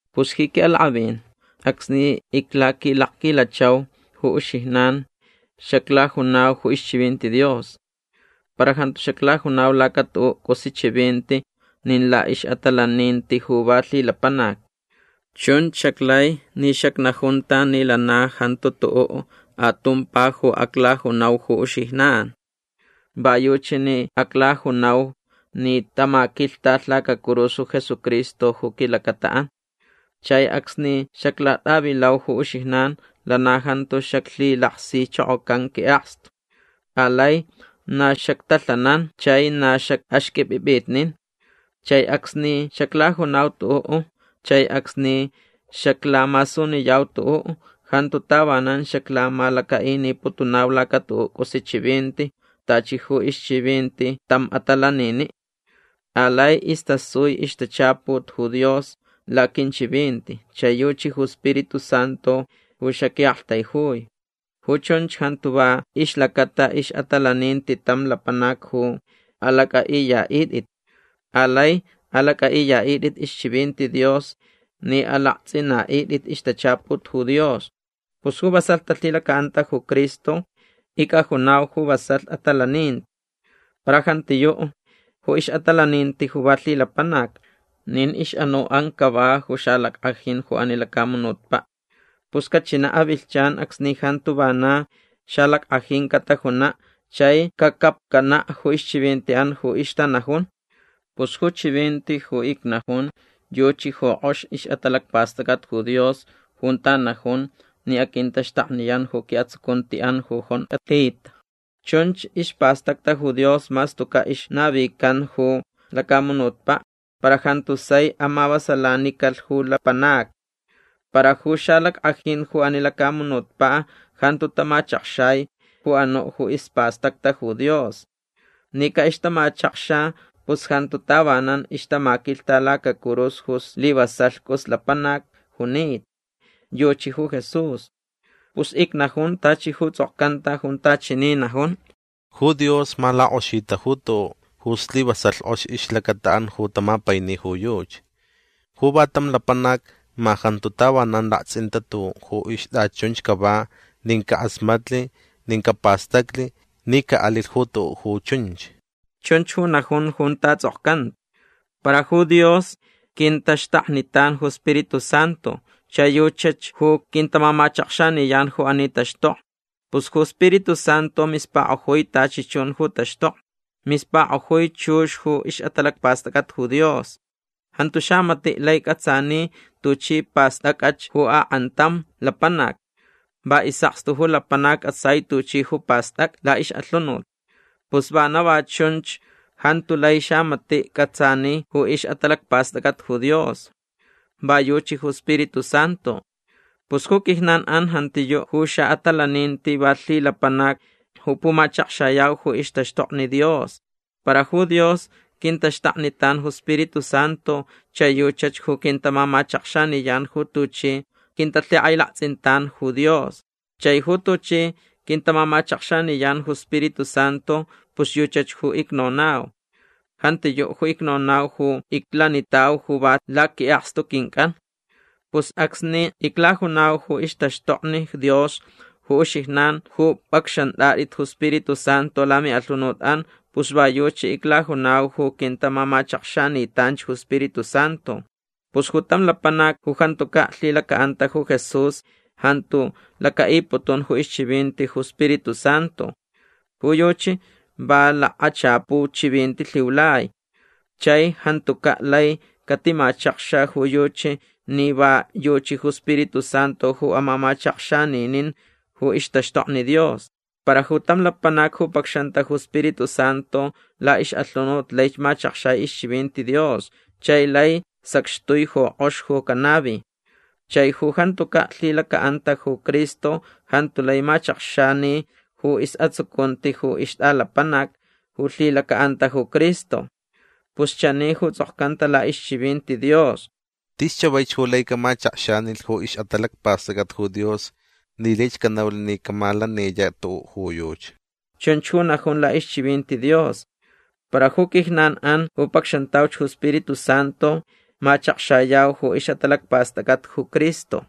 Pus ji quiʼalakʼavin acsni iclaquilakquilachau ju uxijnan xaclajunau ju ixchivinti Dios. Para jantu xaclajunau laca tuʼuʼ cʼusi chivinti nin laʼixʼatalaninti ju va lhilapanac. Chunch xaclai ni xacnajunta ni lana jantu tuʼuʼ atumpa ju aclajunau ju uxijnan. Va yuchi ni aclajunau ni tamaquilhtalh lacacurus ju Jesucristo ju quilacataʼan. Chai acsni xaclatʼavilau ju uxijnan lana jantu xaclhilaksichokocan quiʼakstu. Alai na xactalhanan chai na xacʼaxqʼuipʼipʼitnin. Chai acsni xaclajunau tuʼuʼ chai acsni xaclamasuniyau tuʼuʼ jantu tavanan xaclamalacaʼiniputunau laca tuʼuʼ cʼus chivinti tachi ju ixchivinti tam atalaniniʼ. Alai istasui ixtachaput ju Dios laquinchivinti chai yuchi ju Spiritu Santu ju xaquiʼaktaijui. Ju chunch jantu va ixlacata ixʼatalaninti tam lapanac ju alacʼaʼiyaʼitʼit. Alai alacʼaʼiyaʼitʼit ixchivinti Dios ni alaktsʼinaʼitʼit ixtachaput ju Dios. Pus ju vasalh talhilacaʼanta ju Cristo icʼajunau ju vasalh atalaninti. Para jantiyuʼ ju ixʼatalaninti ju va lhilapanac. Nin ixʼanuʼan cava ju xalackʼajin ju ani lacamunutpaʼ. Pus cachinaʼ avilhchan acsni jantu vana xalackʼajin catajunaʼ chai cacapcanaʼ ju ixchivintiʼan ju ixtanajun. Pus ju chivinti ju icnajun yuchi ju kʼox ixʼatalacpastʼacʼat ju Dios junta najun ni aquintaxtakniyan ju quiʼatsucuntiʼan ju jonkʼalhita. Chunch ispastacta ju Dios mas tucaʼ ixnavican ju lacamunutpaʼ. Para jantu sai amavasalanicalh ju lapanacni. Para ju xalackʼajin ju ani lacamunutpaʼ jantu tamachakxai ju anuʼ ju ispastacta ju Dios. Ni caʼixtamachakxa pus jantu tavanan ixtamaquilhta lacacurus ju slivasalh cʼus lapanac junita. Yuchi ju Jesús. Pus icnajun tachi ju tsʼokcanta junta chani najun: Ju Dios ma lakʼoxita ju tuʼuʼ ju slivasalh kʼox ixlacataʼan ju tamapaini ju yuchi. Ju va tam lapanac ma jantu tavanan laktsʼinta tuʼuʼ ju ixtʼachunch cava nin cakʼasmatlh nin capastaclh ni caʼalilh ju tuʼuʼ ju chunch. Chunch ju najun junta tsʼokcanta. Para ju Dios quintaxtaknitan ju Spiritu Santu chai yuchach ju quintamamachakxaniyan ju ani taxtokni. Pus ju Spiritu Santu mispakʼojui tachi chun ju taxtokni. Mispakʼojui chux ju ixʼatalacpastʼacʼat ju Dios. Jantu xamatiʼ lai cʼatsani tuchi pastʼacʼach ju akʼantam lapanac. Va isʼakstu ju lapanac cʼatsai tuchi ju pastʼacʼa laʼixʼalhunut. Pus vana va chunch jantu lai xamatiʼ cʼatsani ju ixʼatalacpastʼacʼat ju Dios. Va yuchi ju Spiritu Santu. Pus ju quijnanʼan jantiyuʼ ju xaʼatalaninti va lhilapanac ju pumachakxayau ju ixtaxtokni Dios. Para ju Dios quintaxtaknitan ju Spiritu Santu chai yuchach ju quintamamachakxaniyan ju tuchi quintalhikʼailaktsʼintan ju Dios. Chai ju tuchi quintamamachakxaniyan ju Spiritu Santu pus yuchach ju icnonau. Jantiyuʼ ju icnonau ju iclanitau ju va laquiʼakstu quincʼan. Pus acsni iclajunau ju ixtaxtokni Dios ju uxijnan ju pʼacxantʼatʼit ju Spiritu Santu lamiʼalhunutʼan pus va yuchi iclajunau ju quintamamachakxanitanch ju Spiritu Santu. Pus ju tam lapanac ju jantucaʼ lhilacaʼanta ju Jesús jantu lacaʼiputun ju ixchivinti ju Spiritu Santu. Ju yuchi va lakachapu chivinti lhiulai. Chai jantucaʼ lai catimachakxa ju yuchi ni va yuchi ju Spiritu Santu ju amamachakxaninin ju ixtaxtokni Dios. Para ju tam lapanac ju pacxanta ju Spiritu Santu laʼixʼalhunut laich machakxai ixchivinti Dios chai lai sacxtui ju kʼox ju canavi. Chai ju jantucaʼ lhilacaʼanta ju Cristo jantu lai machakxani ju isʼatsucunti ju ixtʼalapanac ju lhilacaʼanta ju Cristo. Pus chani ju tsʼokcanta laʼixchivinti Dios: “Tis chavaich ju lai camachakxanilh ju ixʼatalacpastʼacʼat ju Dios ni laich canaulh ni camalaniyaʼ tuʼuʼ ju yuchi”. Chunch ju najun laʼixchivinti Dios. Para ju quijnanʼan ju pacxantauch ju Spiritu Santu machakxayau ju ixʼatalacpastʼacʼat ju Cristo.